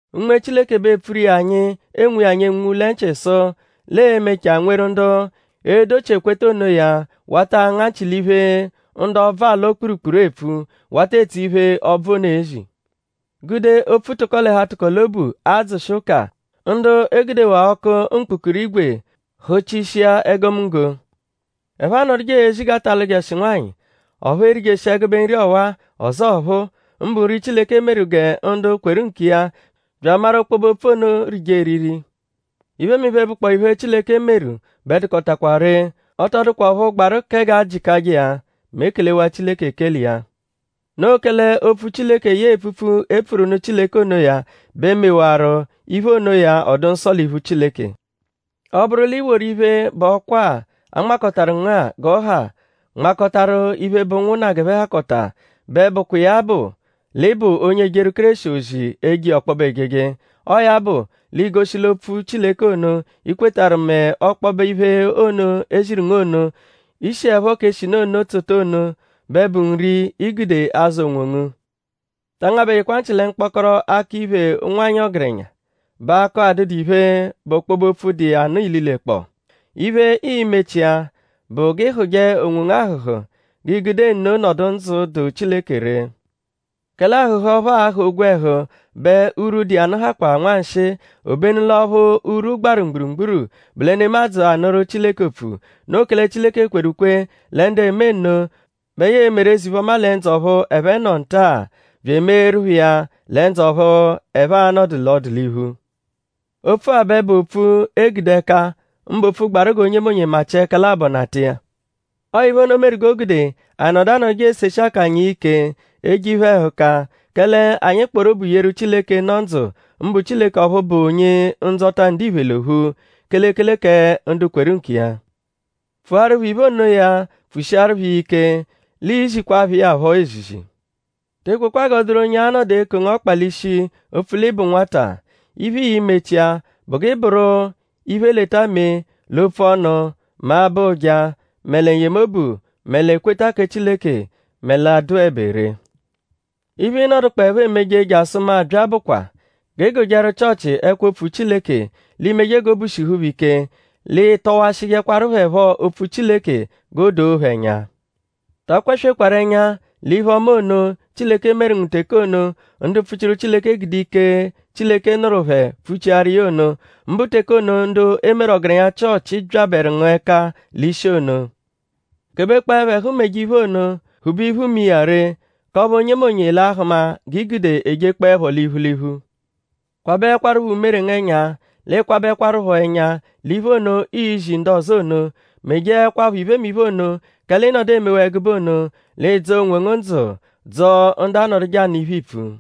Unme Chileke bẹ epfuru iya anyi enwu iya anyi enwunwu lẹ nchị sụ l'e-mechaa nweru ndu e-dochi ekweta onoya wata anga nchị l'iphe, ndu ọbvu alọ-kpurukpuru epfu; wata etso iphe, ọbvu ono ezi. Gude opfu tụko-l'ẹhu-atụko-l'obu adzụshi ụka; ndu e gudewaa ọku mkpụrukpu-ígwè hụchishia egomunggo. Ẹphe anọduje ezi g'a ta alụjeshi nwanyị; ọphu erijeshi ẹgube nri ọwa-a ọzo ọphuu; mbụ nri, Chileke meru gẹ ndu kweru nkiya bya amaru ọkpobe-opfu ono rije eriri. Iphemiphe, bụkpoo iphe, Chileke meru bẹ dụkotakwa ree. Ọ tọ dụkwa ọphu gbaru kẹ g'a jịkaje iya mẹ e kelewaa Chileke ekele iya. Noo kẹle opfu Chileke yẹe epfupfu, e pfuru nụ Chileke onoya bẹ mewaru iphe onoya ọ dụ nsọ l'iphu Chileke. Ọ -bụru l'i woru iphe, bụ ọkwa-a, a nmakọtaru ngu-a g'ọ ha nmakọtaru iphe, bụ ụnwunna g'ẹphe hakọta bẹ bụkwa iya bụ l'ị bụ onye ejeru Kéreshi ozi eje iya ọkpobe ejeje. Ọo ya bụ l'iigoshi l'ọo opfu Chileke ono, i kwetarụ mẹ ọkpobe iphe ono, e ziru ngu ono, i shiẹpho k'eshinu ono tsota ono bẹ bụ nri, i gude azụ onwongu. Ta angabẹjekwa nchị lẹ mkpọkoro akọ-iphè ụnwanyi ọgerenya, bụ akọ adụdu iphe, bụ ọkpobe-opfu, dụ iya nụ ililekpọo. Iphe, ii-mechia bụ g'ị hụ̀je onwongu ahụ̀hù; g'iigude nno nọdu ndzụ, dụ Chileke ree. Kẹle ahụ̀hù ọphu aahụ̀ ogwẹhu bẹ urwu, dụ iya nụ hakwa nwanshịi; obenu l'ọphu urwu gbaru mgburugburu bụ lẹ nemadzụ anụru Chileke opfu. Noo kẹle Chileke kweru ukwe lẹ ndu eme nno bẹ ya e-meru eze-iphe-ọma lẹ ndzụ ọphu ẹphe nọ nta-a; bya emeeru phẹ iya lẹ ndzụ ọphu ẹphe a-nọdu l'ọduliphu. Opfu-a bẹ bụ opfu, e gude ẹka; mbụ opfu gbaru g'onyemonye machịa ẹka labọ nata iya. Ọo iphe ono meru g'o gude anyi nọdu anọduje eseshi akanya iya ike; eje iphe-ẹhuka. Kẹle anyi kpọru obu yeru Chileke, nọ ndzụ; mbụ Chileke ọphu bụ Onye-Ndzọta ndiphe l'ophu; kelekele kẹ ndu kweru nkiya. Pfuaru phẹ iphe onoya pfushiaru phẹ iya ike; l'iizikwaa phẹ iya phọ ezizi. Te ekwekwa g'ọ dụru onye a-nọdu eko ngu ọkpa l'ishi opfu l'ị bụ nwata. Iphe, ịi-mechia bụ g'ị bụru iphe-leta-mee l'opfu ọnu; mẹ abọ ụja; mẹ lẹ n-yemobu; mẹ l'ekweta kẹ Chileke; mẹ l'adụebe ree. Iphe, ịinodukpoepho emeje jasụ mu abya bụkwa: g'ị gụjeru Chịochi ẹkwo-opfu Chileke; l'i meje g'obu shihu phẹ ike; l'ị tọwashijekwaru phẹ phọ opfu Chileke g'o doo phẹ ẹnya. Ta akwaswekwaru ẹnya l'iphe-ọma ono, Chileke meru ngu teke ono, ndu mpfuchiru Chileke gude ike, Chileke nụru phẹ pfuchiaru iya ono; mbụ teke ono, ndu e meru ọgerenya Chịochi byabẹru ngu ẹka l'ishi ono. Kebekpọepho ẹhu meje iphe ono; phube iphu me iya ree; k'ọphu onyemonye l'a-hụma g'i gude ejekpọlepho l'iphu l'iphu. Kwabẹekwarupho umere ngu ẹnya; l'ị kwabẹkwarupho ẹnya l'iphe ono, iizi ndu ọzo ono. Mejeẹkwapho iphemiphe ono; kẹle i -nọdu emewaa ẹgube ono; l'ị dzọo onwongu ndzụ; dzọo ndu anọduje anụ iphe, iipfu.